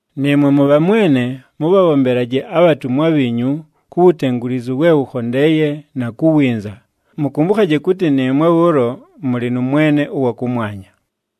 Nɨɨmwe mʉbhamwene, mʉbhabhombelaje abhatumwa bhiinyu ku wutengulizu we wʉkhondeeye na ku winza, mʉkʉmbʉkhaje kʉtɨ nɨɨmwe bhʉʉlo mʉlɨ nʉ Mwene ʉwa kʉmwanya.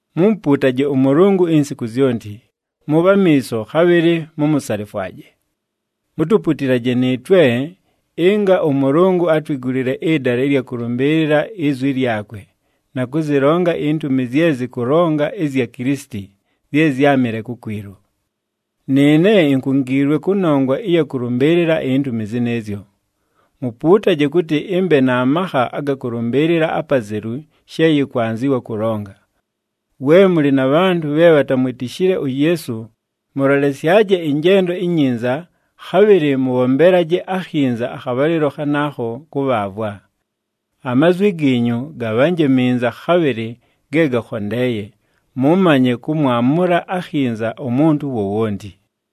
Mumupuutaje ʉMʉlʉngʉ insiku zyonti, mʉbhe amiiso, khabhɨlɨ mumusalifwaje. Mutuputilaje nɨɨtwe ɨnga ʉMʉlʉngʉ atwigulile ɨdala ɨlya kʉlʉmbɨɨlɨla izwi lyakwe, na kʉzɨlonga intumi zye zɨkʉlonga ɨzya Kilisiti zye zyámɨle kukwilu. Nɨɨne inkungiilwe kʉnongwa ɨya kʉlʉmbɨɨlɨla intumi zɨnɨɨzyo. Mupuutaje kʉtɨ ɨmbe na makha aga kʉlʉmbɨɨlɨla apazelu she yɨkwanzɨwa kʉlonga. We mʉlɨ na bhantʉ bhe bhatamwitishile uYeesu, mʉlolesyaje ɨnjendo inyinza, khabhɨlɨ mʉbhombelaje akhinza akhabhalɨlo khanaakho kʉbhaavwa. Amazwi giinyu gabhanje minza, khabhɨlɨ ge gakhondeeye, mʉmanye kʉmwamʉla akhinza umuntu wowonti.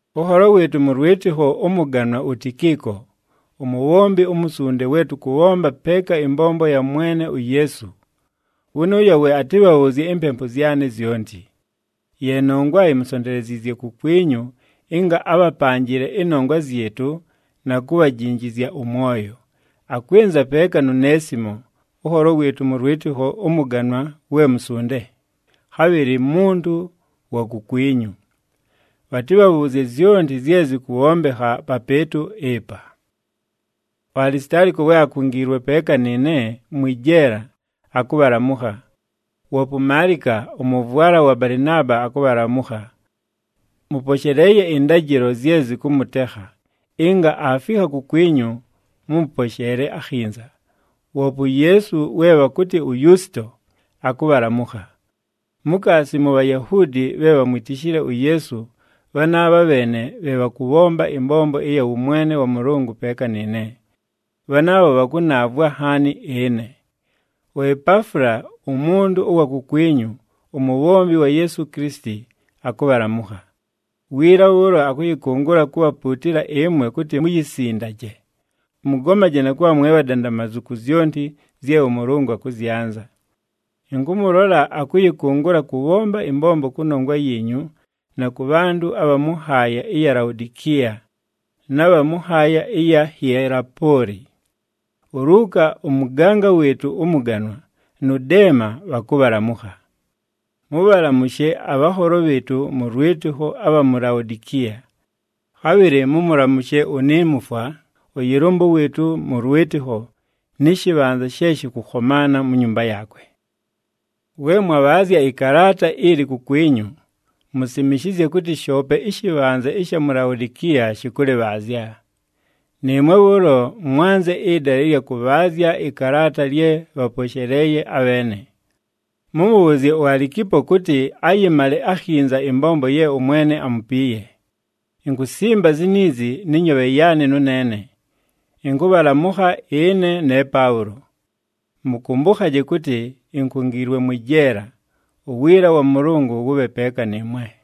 Ʉnholo wɨɨtʉ mʉ lwɨtɨkho ʉmʉganwa uTikiiko, umubhombi umusunde we tʉkʉbhomba peeka ɨmbombo ya Mwene uYeesu. Wʉnʉʉyo we atɨbhabhʉʉzye impempu zyanɨ zyonti. Ye nongwa imusonteleziizye kukwinyu ɨnga abhapanjɨle ɨnongwa zyɨtʉ na kubhajinjizya ʉmwoyo. Akwɨnza peeka nu Neesimo, ʉnholo wɨɨtʉ mʉ lwɨtɨkho ʉmʉganwa we musunde, khabhɨlɨ muntu wa kukwinyu. Bhatɨbhabhʉʉzye zyonti zye zɨkʉbhombekha papɨɨtʉ ɨpa. UAlisitaaliko, we akungiilwe peeka nɨɨne mwɨ jeela, akʉbhalamʉkha. Woope uMaalika, ʉmʉvwala wa Balɨnaaba akʉbhalamʉkha. Mʉposheleeye ɨndajɨlo zye zɨkʉmʉtekha, ɨnga aafikha kukwinyu mʉmʉposheele akhinza. Woope uYeesu we bhakʉtɨ uYusito, akʉbhalamʉkha. Mukaasi mu Bhayahuudi bhe bhamwitishile uYeesu, bhanaabha bheene bhe bhakʉbhomba ɨmbombo ɨya wʉmwene wa Mʉlʉngʉ peeka nɨɨne. Bhanaabho bhakʉnaavwa nhaani ɨne. UEpaafula umuntu ʉwa kukwinyu, umubhombi wa Yeesu Kilisiti, akʉbhalamʉkha. Wiila bhʉʉlo akʉyɨkʉngʉla kubhapuutila ɨmwe kʉtɨ muyisindaje, mʉgomaje na kʉbha mwe bhadandamazu ku zyonti zye ʉMʉlʉngʉ akʉzyanza. Ɨnkʉmʉlola akʉyɨkʉngʉla kʉbhomba ɨmbombo kʉnongwa yiinyu na kʉ bhantʉ abha mʉ nhaaya ɨya mu Laodikiya na bha mʉ nhaaya ɨya mu Hielapooli. ULuuka ʉmʉganga wɨɨtʉ ʉmʉganwa, nʉ Deema bhakʉbhalamʉkha. Mʉbhalamʉshe abhanholo bhɨɨtʉ mʉ lwɨtɨkho abha mu Laodikiya. Khabhɨlɨ mʉmʉlamʉshe uNimufwa, ʉyɨlʉmbʉ wɨɨtʉ mʉ lwɨtɨkho nɨ shɨbhanza she shɨkʉkhomaana mu nyumba yaakwe. We mwabhaazya ɨkalaata ili kukwinyu, musimishizye kʉtɨ shoope ɨshɨbhanza ɨsha mu Laodikiya shɨkʉlɨbhaazya. Nɨɨmwe bhʉʉlo mwanze ɨdala ɨlya kʉbhaazya ɨkalaata lye bhaposheleeye abheene. Mʉmʉbhʉʉzye uAlikipo kʉtɨ ayɨmale akhinza ɨmbombo ye ʉMwene amupiiye. Inkusimba ziniizi nɨ nyoobhe yaanɨ nʉneene: ɨnkʉbhalamʉkha ɨne ne Paʉlo. Mʉkʉmbʉkhaje kʉtɨ inkungiilwe mwɨ jeela. Uwiila wa Mʉlʉngʉ wʉbhe peeka nɨɨmwe.